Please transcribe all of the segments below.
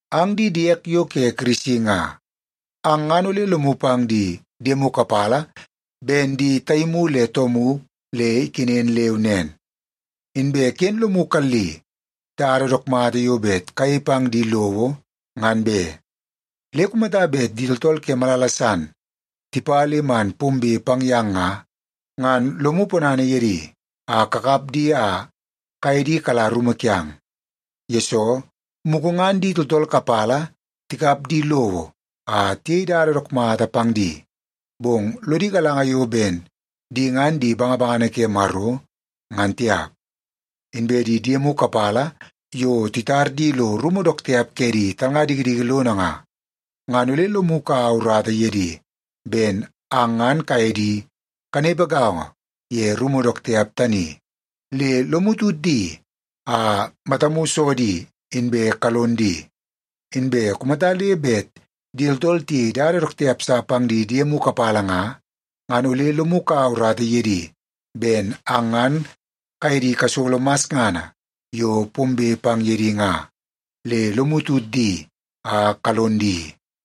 Ang di diek yo ke Kirisi nga, ang ngan ole lomu pang di diemu kapala ben di taimu le toomu le ikenen leu nen. Inbe ken lomu kalli dada dook mata yo bet kayei pang di lowo, ngan be. Le kumata bet di tooltool ke malala san tipa le man pombe pang yang nga, ngan lomu ponana ye di a kakap di a kaye di kala rumu kiang. Yesoo, mugu ngan di tooltool kapala tikap di lowo a tiyei dada dook mata pang di, bong lodi galanga yo ben di ngan di bangabangana ke Maro, ngan tiap. Inbe di diemu kapala yo titar di lo rumu dook tiap ke di talnga dikidiki lono nga, ngan ole lomu kaua urata ye di ben ang ngan kaye di kanepe gaongo ye rumu dook tiap tani. Le lomu tut di a matamu so di inbe kalon di. Inbe kumata le bet di tooltool tiyei dada dook tiap sa pang di diemu kapala nga, ngan ole lomu kaua urata ye di ben ang ngan kaye di kasolo masngana yo pombe pang ye di nga. Le lomu tut di a kalon di.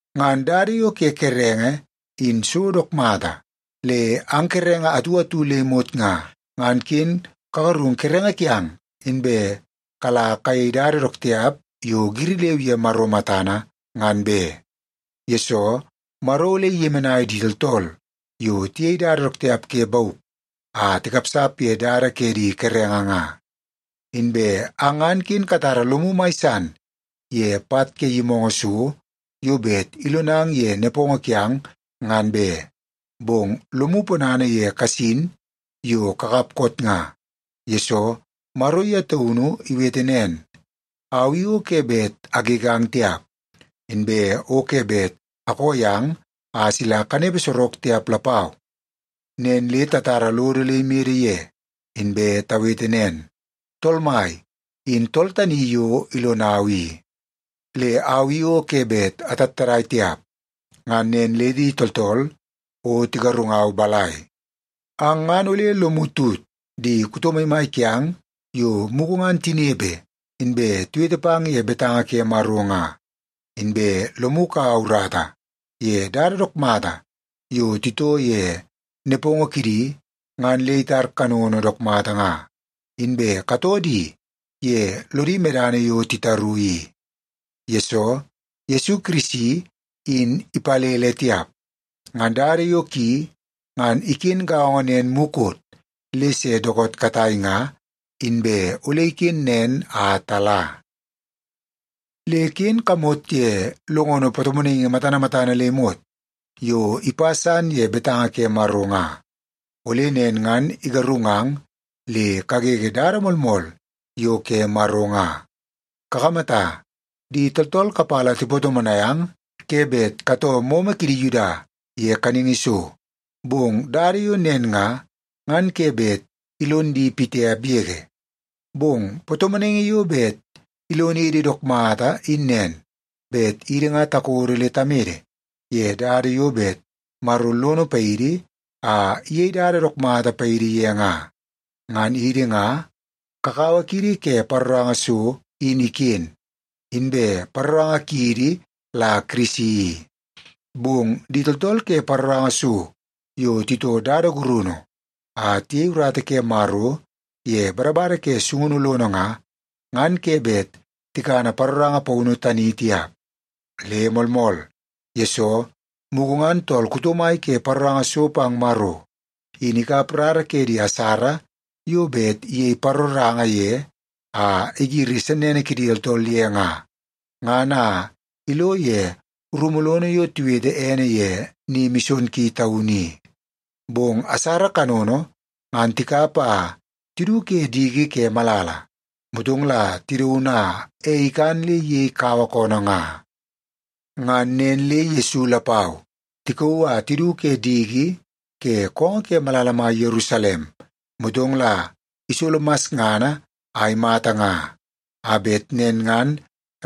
Ngan dada yo ke kerenge in so dook mata. Le ang kerenge atu atu le imot nga, ngan ken kagarung kerenge kiang inbe kala kayei dada dook tiap yo giri leu ye Maro matana, ngan be. Yesoo, Maro ole iyemenai di tooltool yo tiyei dada dook tiap ke bauk a tikapsap ye dada ke di kerenge nga. Inbe ang ngan ken katara lomu mai san ye pat ke yimoongoo so yo bet ilonang ye nepongo kiang, ngan be. Bong lomu ponana ye kasin yo kakap koot nga, yesoo Maro ye taunu iwete nen; “Au i o ke bet agegang tiap, inbe o ke bet akoo yang a sila kanepe sorok tiap lapau.” Nen le tatara lodo le imede ye, inbe tawete nen, “Tool Mai in tool tani yo ilonau i, le au i o ke bet atattadai tiap. Ngan nen le di tooltool o tigarungau balai?” Ang ngan ole lomu tut di kuto maimai kiang yo mugu ngan tinepe inbe tiwete pang ye betanga ke Maro nga. Inbe lomu kaua urata ye dada dook mata yo titoo ye nepongo kidi ngan le itar kanono dook mata nga, inbe katoo di ye lodi medana yo titaru i. Yesoo, Yesu Kirisi in ipalele tiap. Ngan dada yo ki, ngan iken gaongo nen mukot, le se dookoot katai nga, inbe ole iken nen a tala. Le ken kamot ye longono patomonaingi matana matana le imot yo ipa san ye betanga ke Maro nga, ole nen ngan igarungang le kagege dada moolmool yo ke Maro nga. Kakamata, di tooltool kapala tipatomonai ang ke bet katoo momo kidi Yuda ye kaningi so, bong dada yo nen nga, ngan ke bet ilon di pitiap yege. Bong patomonaingi yo bet ilonidi dook mata in nen, bet idi nga takodo le tamede ye dada yo bet Maro lono paidi a iyei dada dook mata paidi ye nga. Ngan idi nga kakawa kiidi ke paroranga so in iken, inbe paroranga kiidi la Kirisi i. Bong di tooltool ke paroranga so yo titoo dada gurunu a tiyei urata ke Maro ye badabada ke sungunu lono nga, ngan ke bet tikana paroranga paunu tani tiap. Le moolmool, yesoo mugu ngan tool kuto mai ke paroranga so pang Maro, in ikap rara ke di asara yo bet iyei paroranga ye a igiri sennene kidi tooltool ye nga, ngan a ilo ye rumu lono yo tiwete ene ye Ni Mison Ki Taunu i. Bong asara kanono, ngan tikap a tidu ke diki ke malala, motong la tidaun a ei ikan le iyei kaua koonoo nga. Ngan nen le Yesu lapau, tikauu a tidu ke diki ke koongoo ke malala mai Yerusalem, motong la isolo masngana a imata nga, a bet nen ngan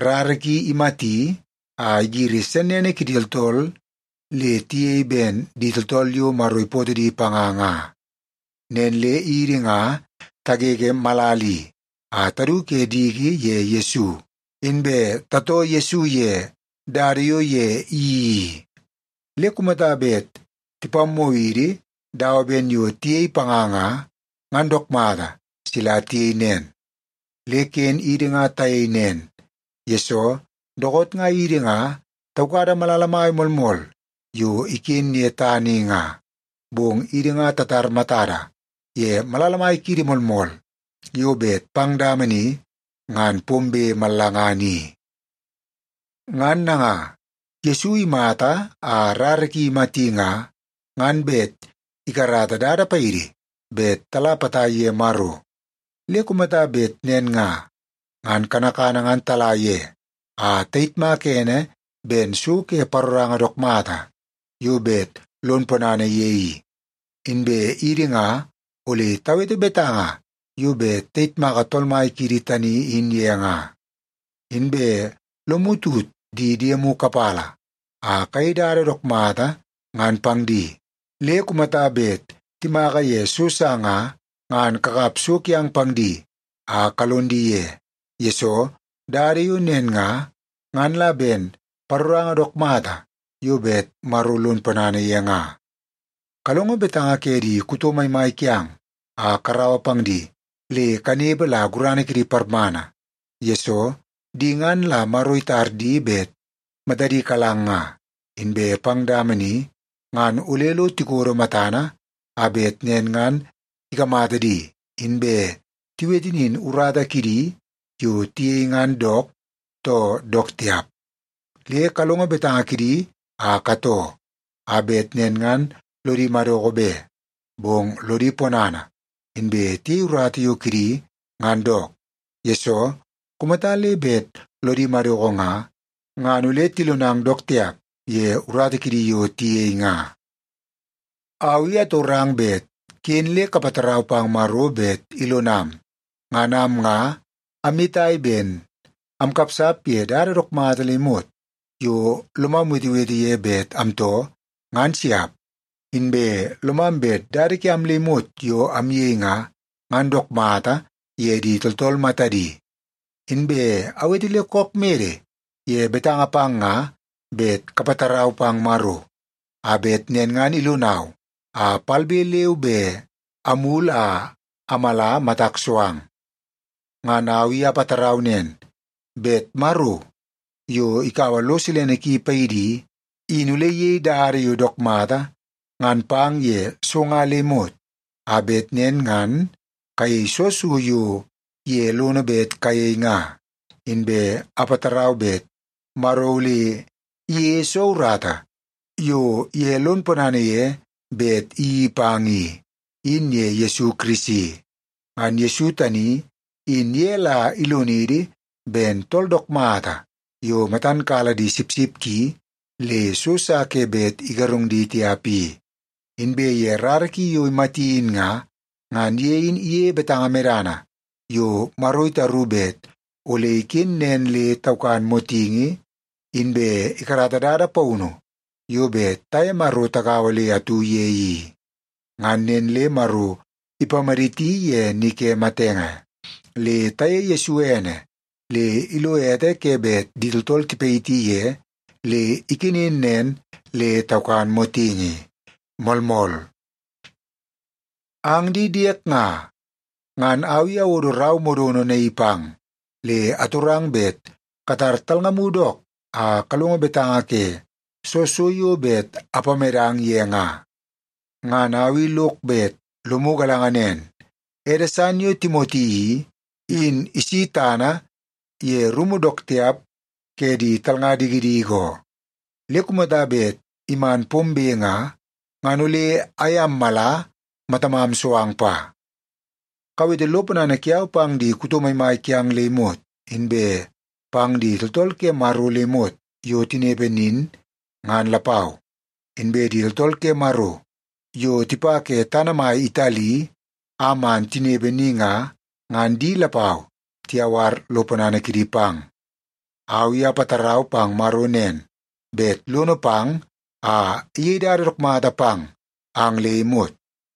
rara ki imati a igiri sennene kidi tooltool le tiyei ben di tooltool yo Maro ipootoo di panga nga. Nen le idi nga tagege malala i a tadu ke diki ye Yesu, inbe tatoo Yesu ye dada yo ye iyeii i. Le kumata bet tipammoo idi dawa ben yo tiyei panga nga, ngan dook mata sila tiyei nen. Le ken idi nga tayei nen, yesoo dookoot nga idi nga taukada malala mai moolmool yo iken ye tana i nga, bong idi nga tatar matada ye malala mai kiidi moolmool yo bet pang dama ni ngan pombe mallangana i. Ngan nanga, Yesu imata a rara ki imati nga, ngan bet ikarata dada paidi bet tala potai ye Maro. Le kumata bet nen nga, ngan kanakana ngan tala ye a tayitmaka ene ben so ke paroranga dook mata yo bet lon ponana ye i. Inbe idi nga ole tawete betanga yo bet tayitmaka Tool Mai kiidi tani in ye nga. Inbe lomu tut di diemu kapala a kayei dada yo dook mata ngan pang di. Le kumata bet timaka ye so sa nga, ngan kakap so kiang pang di a kalon di ye, yesoo dada yo nen nga, ngan la ben paroranga dook mata yo bet Maro lon ponana ye nga. Kalongo betanga ke di kuto maimai kiang a karaua pang di le kanepe la gurana kidi parmana. Yesoo, di ngan la Maro itar di bet matadi kalang nga, inbe pang dama ni ngan ole lo tikodo matana, a bet nen ngan ikamata di, inbe tiwete nin urata kidi yo tiyei ngan dook, too dook tiap. Le kalongo betanga kidi a katoo, a bet nen ngan lodi madoko be, bong lodi ponana, inbe tiyei urata yo kidi ngan dook. Yesoo, kumata le bet lodi madoko nga, ngan ole tilonang dook tiap ye urata kidi yo tiyei nga. Au i atorang bet ken le kapatarau pang Maro bet ilonam. Ngan am nga amyetai ben amkapsap ye dada dook mata le imot yo lomam wetewete ye bet amtoo, ngan siap. Inbe lomam bet dada kiam le imot yo amyei nga, ngan dook mata ye di tooltool matadi. Inbe awete le kook mede ye betanga pang nga bet kapatarau pang Maro, a bet nen ngan ilonau a palbe leu be amulu a amala matak so ang. Ngan au i apatarau nen, bet Maro, yo ikaua lo silene ki paidi i, in ole iyei dada yo dook mata ngan pang ye so nga le imot, a bet nen ngan kayei soo so yo ye lono bet kayei nga. Inbe apatarau bet Maro ole iyeie soo urata yo ye lon ponana ye bet iyeii pang i, in ye Yesu Kirisi. Ngan Yesu tani in ye la ilonidi ben tool dook mata yo matan kala di sipsip ki le so sa ke bet igarung di tiap i. Inbe ye rara ki yo imati in nga, ngan ye in iyeie betanga medana yo Maro itaru bet ole iken nen le taukan motingi, inbe ikarata dada paunu yo bet taye Maro tagaua le atu ye i. Ngan nen le Maro ipamaditi ye ni ke matenge. Le tayeie Yesu ene le ilo ete ke bet di tooltool tipayiti ye le ikenen nen le taukan motingi. Moolmool! Ang di diek nga, ngan au i awodo rau modono naii pang, le atorang bet katar talngamu dook a kalongo betanga ke soo so yo bet apamedang ye nga. Ngan au i lok bet lomu galanga nen, ede san yo Timoti i, in isi tana ye rumu dook tiap ke di talnga dikidiki oo. Le kumata bet iman pombe nga, ngan ole aye ammala matamam so ang pa. Kawete lo ponana kiau pang di kuto maimai kiang le imot, inbe pang di tooltool ke Maro le imot yo tinepe nin, ngan lapau. Inbe di tooltool ke Maro yo tipa ke tana mai Itali a man tinepe ni nga, ngan di lapau tiyawar lo ponana kidi pang. Au i apatarau pang Maro nen, bet lono pang a iyei dada dook mata pang ang le imot.